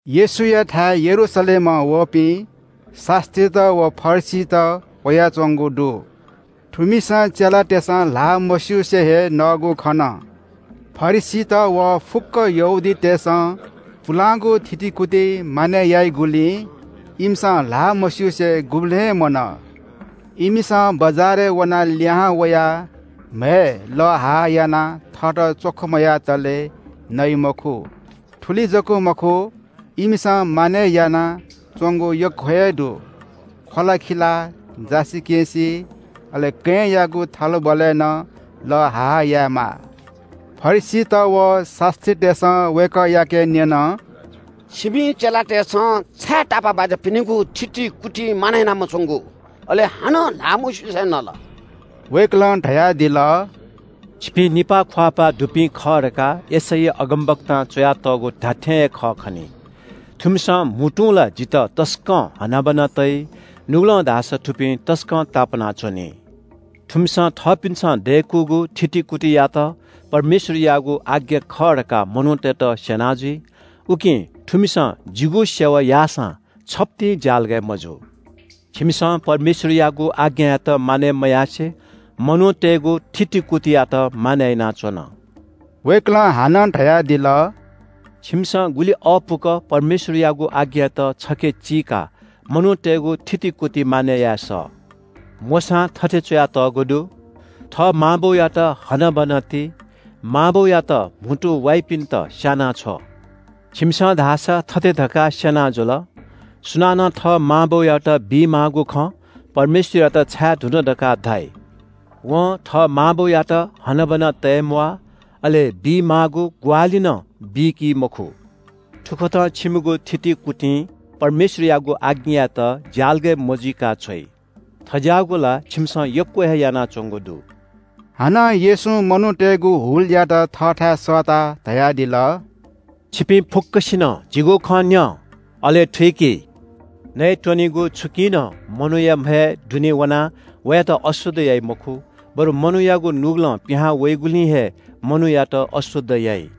येशूयाथाय् यरूशलेमं वःपिं शास्‍त्रीत व फरिसीत वयाच्‍वंगु दु। थुमिसं चेलातय्‌सं ल्‍हाः मस्‍युसे हे नःगु खन। फरिसीत व फुक्‍क यहूदीतय्‌सं पुलांगु थितिकुति मानय् याइगुलिं इमिसं ल्‍हाः मस्‍युसे गुबलें मनः। इमिसं बजारय् वनाः लिहां वयाः म्‍हय् लः हा हा यानाः थःत च्‍वख मयातले नइ मखु। थुलि जक मखु, इमिसं मानय् यानाच्‍वंगु यक्‍व हे दु – ख्‍वलाखिला, जासिकेँसि, अले कँय्‌यागु थलबलय् नं लः हा हा यायेमाः। फरिसीत व शास्‍त्रीतय्‌सं वय्‌कःयाके न्‍यन – “छिमि चेलातय्‌सं छाय् तापाःबाज्‍यापिनिगु थितिकुति मानय् याना मच्‍वंगु, अले हानं ल्‍हाः मस्‍युसे नल?” वय्‌कलं धयादिल – “छिपिं निपाः ख्‍वाःपाः दुपिं खः धकाः यशैया अगमवक्तां च्‍वयातःगु धात्‍थें हे खः खनी – “‘थुमिसं म्‍हुतुं ला जितः तसकं हनाबना तइ। नुगलं धाःसा थुपिं तसकं तापाना च्‍वनी। थुमिसं थःपिन्‍सं दय्‌कूगु थितिकुतियात परमेश्‍वरयागु आज्ञा खः धकाः मनूतय्‌त स्‍यना जुइ। उकिं थुमिसं जिगु सेवा याःसां छप्‍तिं ज्‍यालगय् मजू।’ “छिमिसं परमेश्‍वरयागु आज्ञायात मानय् मयासें मनूतय्‌गु थितिकुतियात मानय् यानाच्‍वन।” वय्‌कलं हानं धयादिल – “छिमिसं गुलि अःपुक परमेश्‍वरयागु आज्ञायात छखे चीकाः मनूतय्‌गु थितिकुति मानय् याये सः। मोशां थथे च्‍वयातःगु दु – ‘थः मां बौयात हनाबना ति। मां बौयात म्‍हुतु वाइपिन्‍त स्‍यानाछ्व।’ छिमिसं धाःसा थथे धकाः स्‍यना जुल – ‘सुनानं थः मां बौयात बीमाःगु खँ परमेश्‍वरयात छाये धुन धकाः धाइ (थुकियात कुर्बान धाइ) वं थः मां बौयात हनाबना तये म्‍वाः, अले बीमाःगु ग्‍वाहालि नं बीकी मखु।’ थुकथं छिमिगु थितिकुतिं परमेश्‍वरयागु आज्ञायात ज्‍यालगय् मजुइका छ्वइ। थज्‍याःगु ला छिमिसं यक्‍व हे यानाच्‍वंगु दु।” हानं येशूं मनूतय्‌गु हुलयात थःथाय् सःताः धयादिल – “छिपिं फुक्‍कसिनं जिगु खँ न्‍यँ, अले थुइकि। नयेत्‍वनेगु छुकिं नं मनूया म्‍हय् दुने वनाः वयात अशुद्ध याइ मखु, बरु मनूयागु नुगलं पिहां वइगुलिं हे मनूयात अशुद्ध याइ।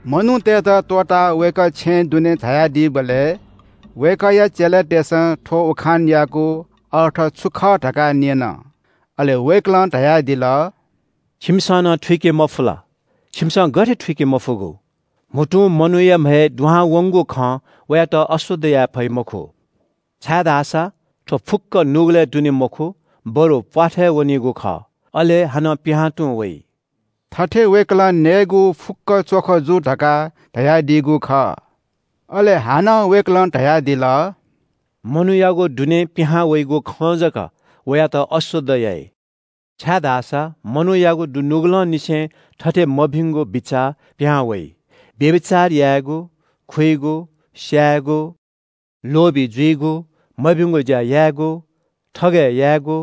मनूतय्‌त त्‍वःताः वय्‌कः छेँय् दुने झायादीबलय् वय्‌कःया चेलातय्‌सं थ्‍व उखानयागु अर्थ छु खः धकाः न्‍यन। अले वय्‌कलं धयादिल – “छिमिसं नं थुइके मफु ला? छिमिसं गथे थुइके मफुगु? म्‍हुतुं मनूया म्‍हय् दुहां वंगु खं वयात अशुद्ध याये फइ मखु। छाय्‌धाःसा थ्‍व फुक्‍क नुगलय् दुने मखु, बरु प्‍वाथय् वनीगु खः, अले हानं पिहां तुं वइ।” (थथे वय्‌कलं नयेगु फुक्‍क च्‍वख जू धकाः धयादीगु खः) अले हानं वय्‌कलं धयादिल – “मनूयागु दुनें पिहांवइगु खं जक वयात अशुद्ध याइ, छाय्‌धाःसा मनूयागु दुनुगलंनिसें थथे मभिंगु बिचाः पिहां वइ – व्‍यभिचार यायेगु, खुइगु, स्‍यायेगु, लोभी जुइगु, मभिंगु ज्‍या यायेगु, थगय् यायेगु,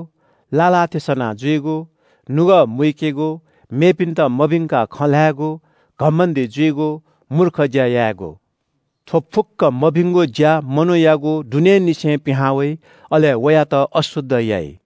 लाः लाः थें सनाः जुइगु, नुगः मुइकेगु, मेपिन्‍त मभिंकाः खँ ल्‍हायेगु, घमण्‍डी जुइगु, मूर्ख ज्‍या यायेगु। थ्‍व फुक्‍क मभिंगु ज्‍या मनूयागु दुनेंनिसें पिहां वइ, अले वयात अशुद्ध याइ।”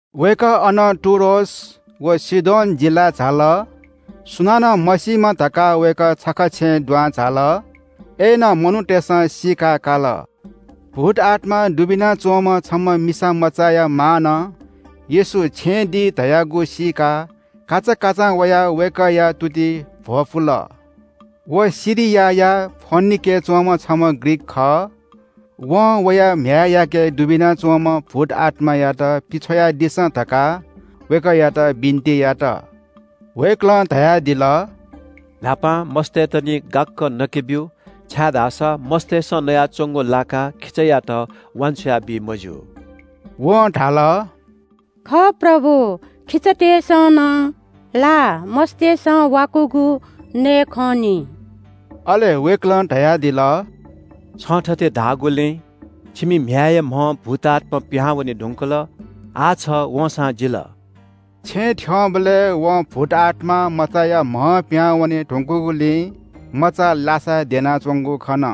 वय्‌कः अनं टुरोस व सीदोन जिल्‍लाय् झाल। सुनानं मसीमा धकाः वय्‌कः छखा छेँय् दुहां झाल। अय्‌नं मनूतय्‌सं सीकाकाल। भूतआत्‍मा दुबिना च्‍वंम्‍ह छम्‍ह मिसामचाया मांनं येशू छेँय् दी धयागु सीकाः काचाकाचां वयाः वय्‌कःया तुतिइ भ्‍वपुल। व सिरियाया फोनिकेय् च्‍वंम्‍ह छम्‍ह ग्रीक खः। वं वया म्‍ह्याय्‌याके दुबिना च्‍वंम्‍ह भूतआत्‍मायात पिछ्वयादिसँ धकाः वय्‌कःयात बिन्‍ति यात। वय्‌कलं धयादिल – “न्‍हापां मस्‍तय्‌त निं गाक्‍क नके ब्‍यु, छाय्‌धाःसा मस्‍तय्‌सं नयाच्‍वंगु लाकाः खिचायात वान्‍छ्वया बी मज्‍यू।” वं धाल – “खः प्रभु, खिचातय्‌सं नं ला मस्‍तय्‌सं वाकूगु नये खं निं।” अले वय्‌कलं धयादिल – “छं थथे धाःगुलिं छिमि म्‍ह्याय्‌या म्‍हं भूतआत्‍मा पिहां वने धुंकल, आः छ वंसां जिल।” छेँ थ्‍यंबलय् वं भूतआत्‍मा मचाया म्‍हं पिहां वने धुंकूगुलिं मचा लासाय् द्यनाच्‍वंगु खन।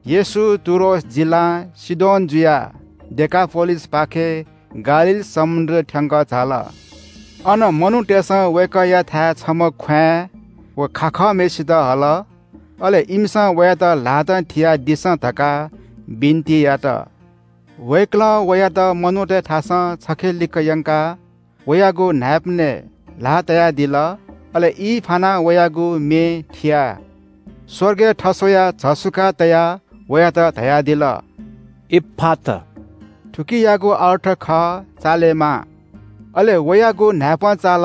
येशू टुरोस जिल्‍लां सीदोन जुयाः डेकापोलिसपाखें गालील समुद्र थ्‍यंक झाल। अन मनूतय्‌सं वय्‌कःयाथाय् छम्‍ह ख्‍वाँय् व खाखःम्‍हय्‌सित हल, अले इमिसं वयात ल्‍हातं थियादिसँ धकाः बिन्‍ति यात। वय्‌कलं वयात मनूतय्‌थासं छखेलिक यंकाः वयागु न्‍हाय्‌पनय् ल्‍हाः तयादिल। अले ई फानाः वयागु मे थियाः स्‍वर्गय् थस्‍वयाः झसुकाः तयाः वयात धयादिल – “इफ्‍फात!” थुकियागु अर्थ खः – “चालेमा!” अले वयागु न्‍हाय्‌पं चाल,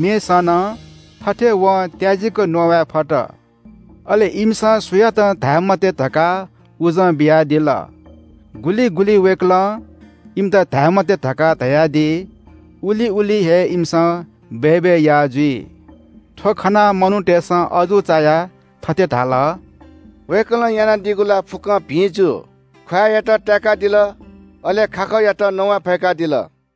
मे सन, थथे वं त्‍याजिक नवाये फत। अले “इमित सुयातं धाये मते” धकाः उजं बियादिल। गुलि गुलि वय्‌कलं इमित धाये मते धकाः धयादी, उलि उलि हे इमिसं बय्‌बय् याः जुइ। थ्‍व खनाः मनूतय्‌सं अजू चायाः थथे धाल – “वय्‌कलं यानादीगु ला फुक्‍कं भिं जू, ख्‍वाँय्‌यात ताय्‌कादिल, अले खाखःयात नवाये फय्‌कादिल।”